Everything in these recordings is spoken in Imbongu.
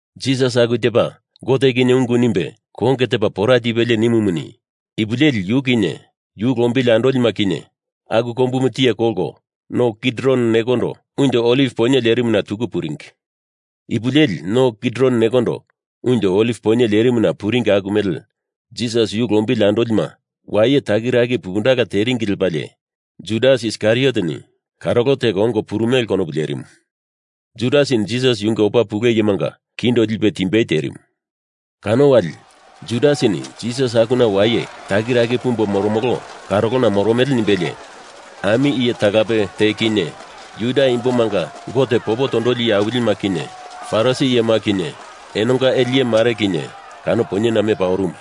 Jisas aku tepa Gote kinye ungu nimbe konge tepa pora tipelie nimumuni, ipu leli yu kinye yu lombili andolima kinye aku kombumu tiye kolko No Kidron nekondo Unjo Oliv Poinye lerimuna tuku puringi. Ipu leli no Kidron nekondo unjo Oliv poinye lerimuna puringi aku mele Jisas yu lombili andolima waye takiraki pupundala teringi lepalie Judas Iskarioteni karolo teko ongo purumele konopu lerimu. Judasini Jisas yunge opa pule iyemanga kindo lipe timbei terimu. Kano wali Judasini Jisas akuna waye takiraki pumbo moromolo karolona moromele nimbelie, ami iye talape te kinye Juda imbomanga Gote popo tondoli iye awilima kinye Farisi iyema kinye enonga ele iye mare kinye kano poinyena mepa orumu.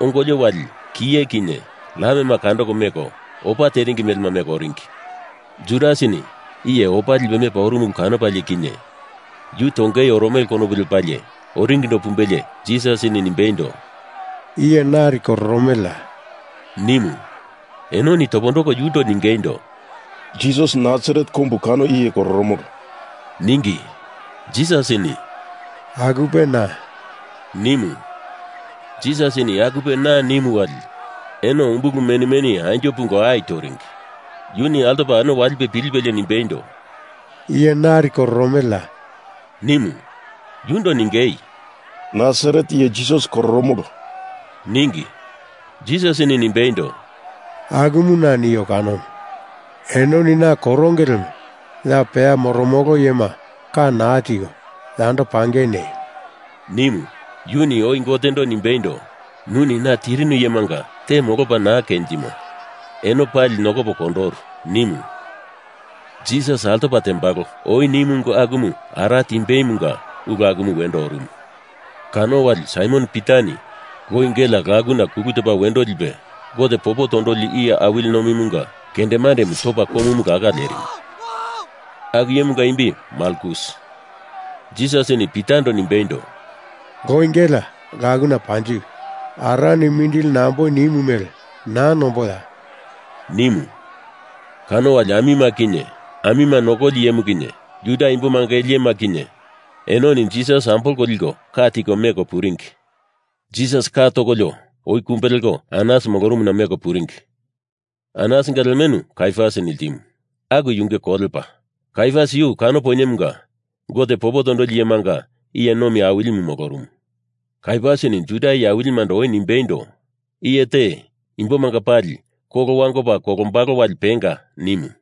Ongolio wali kiye kinye lamema kandoko meko opa teringi melema meko oringi. Judasini iye opa lipe mepa orumu ulu kanopalie kinye yu tongei oromele konopu lepalie oringindo pumbelie Jisasini nimbeindo, “Iye nari kororomeleya?” nimu. Enoni topondoko yundo ningeindo, “Jisas Nasaret kombu kano iye kororomolo,” ningi. Jisasini “Akupe na,” nimu. Jisasini akupe na nimu wali eno umbulu meni meni anjo pungo ai toringi. Yuni altopa eno walipe pilipelie nimbeindo, “Iye nari kororomeleya?” nimu. Yundo ningei, “Nasaret iye Jisas kororomolo,” ningi. Jisasini nimbeindo, “Akumu na, nio kanomu. Enoni na koronge lemo ya peya moromolo iyema ka naa tiko, yando pangei neio!” nimu. Yuni oi Gotendo nimbeindo, ‘Nuni na tirinu iyemanga te molopa naa kenjimo, eno pali nokopo kondoru,’ nimu. Jisas altopa tembalo oi nimu ungu akumu ara timbeimunga ulu akumu wendo orumu. Kano wali Saimon Pitani loi gelea lakuna kulu topa wendo lipe Gote popo tondoli iye awili nomimunga kendemandemu topa komumu laka lerimu. Aku iyemunga imbi Malkus. Jisasini Pitando nimbeindo, “Loi gelea lakuna panjiwi! Arani mindili namboi nimu mele naa nomboya?” nimu. Kano wali amima kinye amima nokoli iyemu kinye Juda imbomanga ele iyema kinye enoni Jisas ambolko liko ka tiko meko puringi. Jisas ka tokolio oi kumbe leko Anas molorumuna meko puringi. Anasinga lemenu Kaiafasini ltimu. Aku yunge kolepa. Kaiafas yu kano poinyemunga Gote popo tondoli iyemanga iye nomi Awilimu molorumu. Kaiafasini Juda iye awilimando oi nimbeindo, “Iye te imbomanga pali kolo wangopa kolombalo wali penga,” nimu.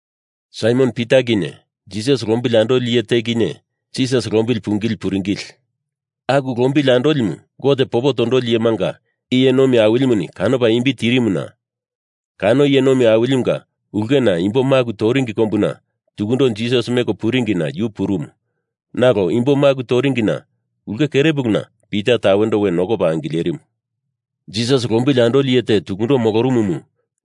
Saimon Pita kinye Jisas lombili andoli iye te kinye Jisas lombili pungili puringili. Aku lombili andolimu Gote popo tondoli iyemanga iye nomi awilimuni kanopa imbi tirimuna, kano iye nomi awilimunga ulkena imbo maku toringi kombuna tukundo Jisas meko puringina yu purumu nalo imbo maku toringi ulke kere puluna Pita tawendo we nokopa angilerimu. Jisas lombili andoli iye te tukundo molorumumu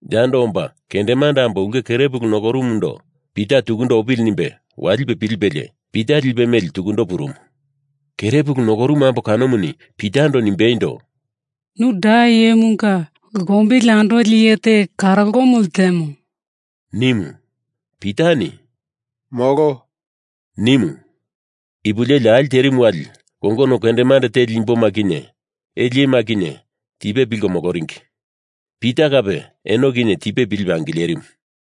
yando omba kendemande ambo ulke kere pulu nokorumumundo Pita tukundo opili nimbe walipe pilipelie Pita lipe meli tukundo purumu. Kere pulu nokorumu ambo kanomuni Pitando nimbeindo, “Nu da iyemunga lombili andoli iye te karolomu ltemo,” nimu. Pitani “Molo!” nimu. Ipu leli ali terimu wali kongono kendemande teli imboma kinye ele iyema kinye tipe pilko moloringi. Pita kape eno kinye tipe pilipe angilerimu.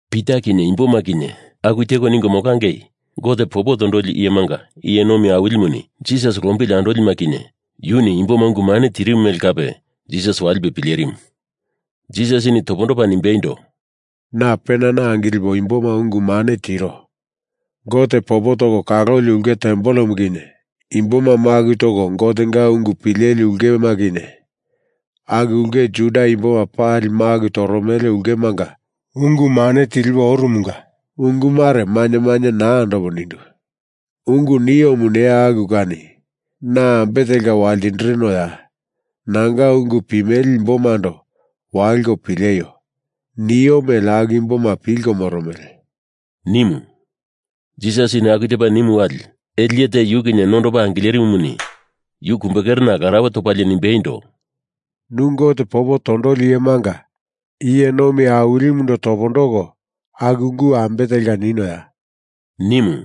Pita kinye imboma kinye aku teko ningo molangei Gote popo tondoli iyemanga iye nomi awilimuni Jisas lombili andolima kinye yuni imboma ungu mane tirimu mele kape Jisas walipe pilerimu. Jisasini topondopa nimbeindo, “Na penana angilipo imboma ungu mane tiro. Gote popo toko kaloli ulke tempelemu kinye imboma maku toko Gotenga ungu pileli ulkema kinye aku ulke Juda imboma pali maku toromele ulkemanga ungu mane tilipo oromunga ungu mare mainye mainye naa andopo nindu. Ungu niomu neya aku kani, na ambe telka waltindirinoya? Nanga ungu pimele imbomando waliko pileio! Nio mele aku imboma pilko moromele,” nimu. Jisasini aku tepa nimu wali ele iye te yu kinye nondopa angilerimumuni yu kumbekerena larauwe topalie nimbeindo, “Nu Gote popo tondoli iyemanga iye nomi awilimundo topondoko aku ungu ambe telka ninoya?” nimu.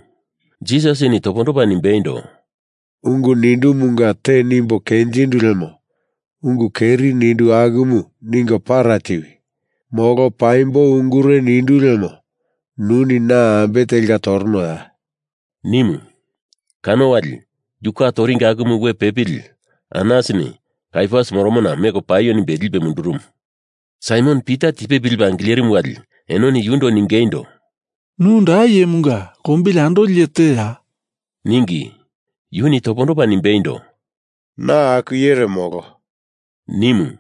Jisasini topondopa nimbeindo, “Ungu nindumunga te nimbo kenjindu lemo ungu keri nindu akumu ningo para tiwi! Molo paimbo ungure nindu lemo nuni na ambe telka toronoya?” nimu. Kano wali yu ka toringi akumu we pepili Anasini Kaiafas moromona meko paio nimbe lipe mundurumu. Saimon Pita tipe pilipe angilerimu wali enoni yundo ningeindo, “Nu da iyemunga lombili andoli iye teya?” ningi. Yuni topondopa nimbeindo, “Na aku iyere molo,” nimu.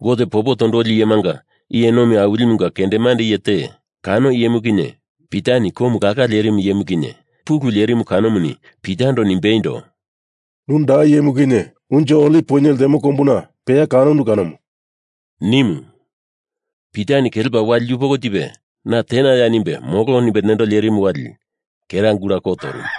Gote popo tondoli iyemanga iye nomi awilimunga kendemande iye te, kano iyemu kinye Pitani komu laka lerimu iyemu kinye pulu lerimu kanomuni Pitando nimbeindo, “Nu da iyemu kinye unjo Oliv poinye ltemo kombuna peya kanondu kanomu,” nimu. Pitani kelepa wali yupoko tipe na tenaya nimbe molo nimbe nendo lerimu wali kera gula ko torumu.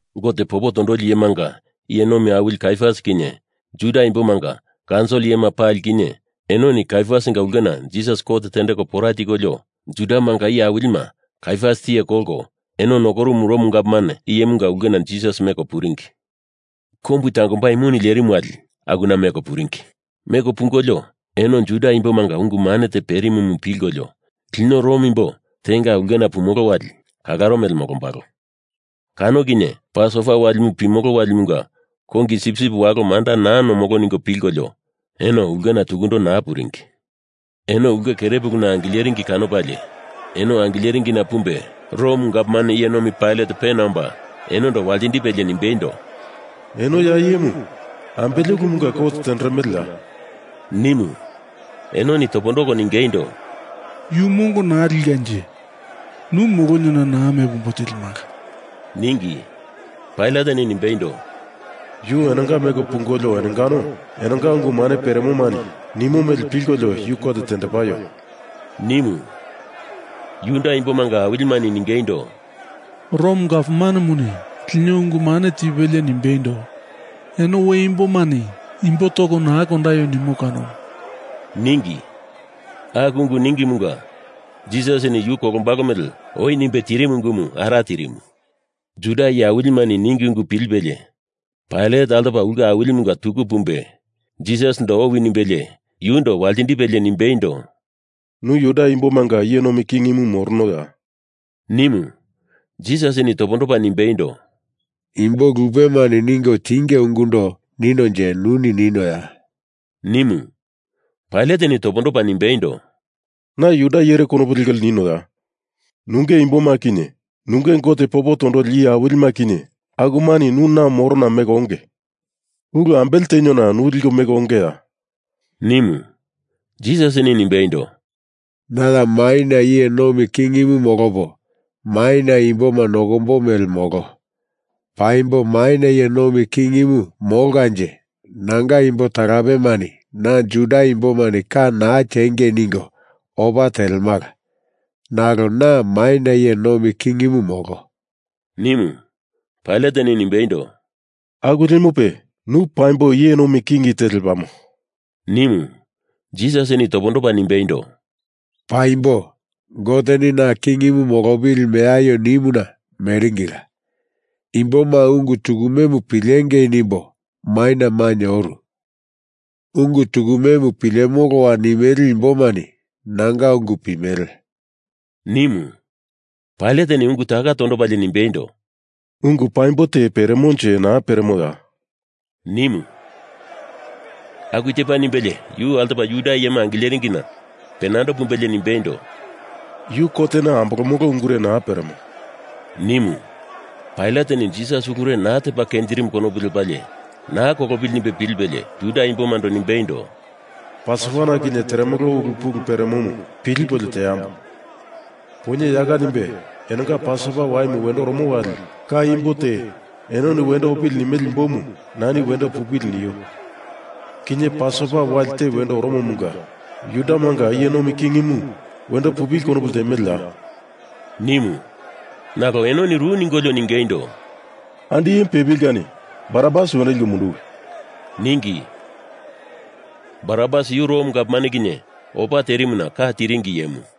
Gote popo tondoli iyemanga iye nomi awili Kaiafas kinye Juda imbomanga kaunsil iyema pali kinye enoni Kaiafasinga ulkena Jisas kot tendeko pora tikolio, Judamanga iye awilima Kaiafas tiye kolko eno nokorumu Rom gavman iyemunga ulkena Jisas meko puringi. Kombu tangombai mune lerimu wali akuna meko puringi. Meko pungolio eno Juda imbomanga ungu mane te perimumu pilkolio lino Rom imbo tenga ulkena pumolo wali kalaro mele molombalo, kano kinye Pasova Walimu pimolo walimunga kongi sipsip walo manda naa nomolo ningo pilkolio eno ulkena tukundo naa puringi. Eno ulke kerepuluna angileringi kanopalie eno angileringina pumbe Rom gavman iye nomi Pailat pena omba enondo waltindipelie nimbeindo, “Eno ya iyemu ambele ulumunga kot tenderemeleya?” nimu. Enoni topondoko ningeindo, “Yu mongo naa likanje nu moloniona naa mepo ombo tilimala,” ningi. Pailateni nimbeindo, “Yu enonga meko pungolio enongano enonga ungu mane peremomani nimo mele pilkolio yu kot tendepaio!” nimu. Juda imbomanga awilimani ningeindo, “Rom gavmanemuni lino ungu mane tipelie nimbeindo, eno we imbomani imbo toko naa kondaio nimo kanomu,” ningi. Aku ungu ningimunga Jisasini yu kolombalo mele oi nimbe tirimu ungumu ara tirimu. Juda iye awilimani ningi ungu pilipelie, Pailat altopa ulke awilimunga tuku pumbe Jisasindo owi nimbelie yundo waltindipelie nimbeindo, “Nu Juda imbomanga iye nomi kingimu moronoya?” nimu. Jisasini topondopa nimbeindo, “Imbo lupemani ningo tinge ungundo ninonje nuni ninoya?” nimu. Pailateni topondopa nimbeindo, “Na Juda iyere konopu lekolio ninoya? Nunge imboma kinye nunge Gote popo tondoli iye awilima kinye akumani nu na morona meko onge. Ulu ambele teniona nu liko meko ongeya?” nimu. Jisasini nimbeindo, “Na ya maina iye nomi kingimu molopo maina imboma nokombo mele molo. Paimbo maina iye nomi kingimu molkanje nanga imbo talapemani na Juda imbomani ka naa tiengei ningo opa telemala. Nalo na maina iye nomi kingimu, molo,” nimu. Pailateni nimbeindo, “Aku lemope nu paimbo iye nomi king te lepamo,” nimu. Jisasini topondopa nimbeindo, “Paimbo. Goteni na kingimu molopili meaio nimuna meringila. Imboma ungu tukumemu pilengei nimbo maina mainye oru. Ungu tukumemu pilemoloa nimele imbomani nanga ungu pimele,” nimu. Pailateni ungu taka tondopalie nimbeindo, “Ungu paimbo te peremonje naa peremoya?” nimu. Aku tepa nimbelie yu altopa Juda iyema angileringina penando pumbelie nimbeindo, “Yu kotena ambolomolo ungure naa peremo,” nimu. Pailateni Jisas ulure naa tepa kenjirimu konopu lepalie naa kolopili nimbe pilipelie Juda imbomando nimbeindo, “Pasova na kinye teremolo ulu pulu peremomu pilipolio teambo! Poinye yaka nimbe enonga Pasova Waimu wendo oromo wali ka imbo te enoni wendo opili nimele imbomu nani wendo pupili nio. Kinye Pasova Wali te wendo oromomunga Judamanga iye nomi kingimu wendo pupili konopu ltemeleya!” nimu. Nalo enoni ru ningolio ningeindo, “Andi iyemu pepili kani Barabas wendo liko munduwi!” ningi. Barabas yu Rom gavman kinye opa terimuna ka tiringi iyemu.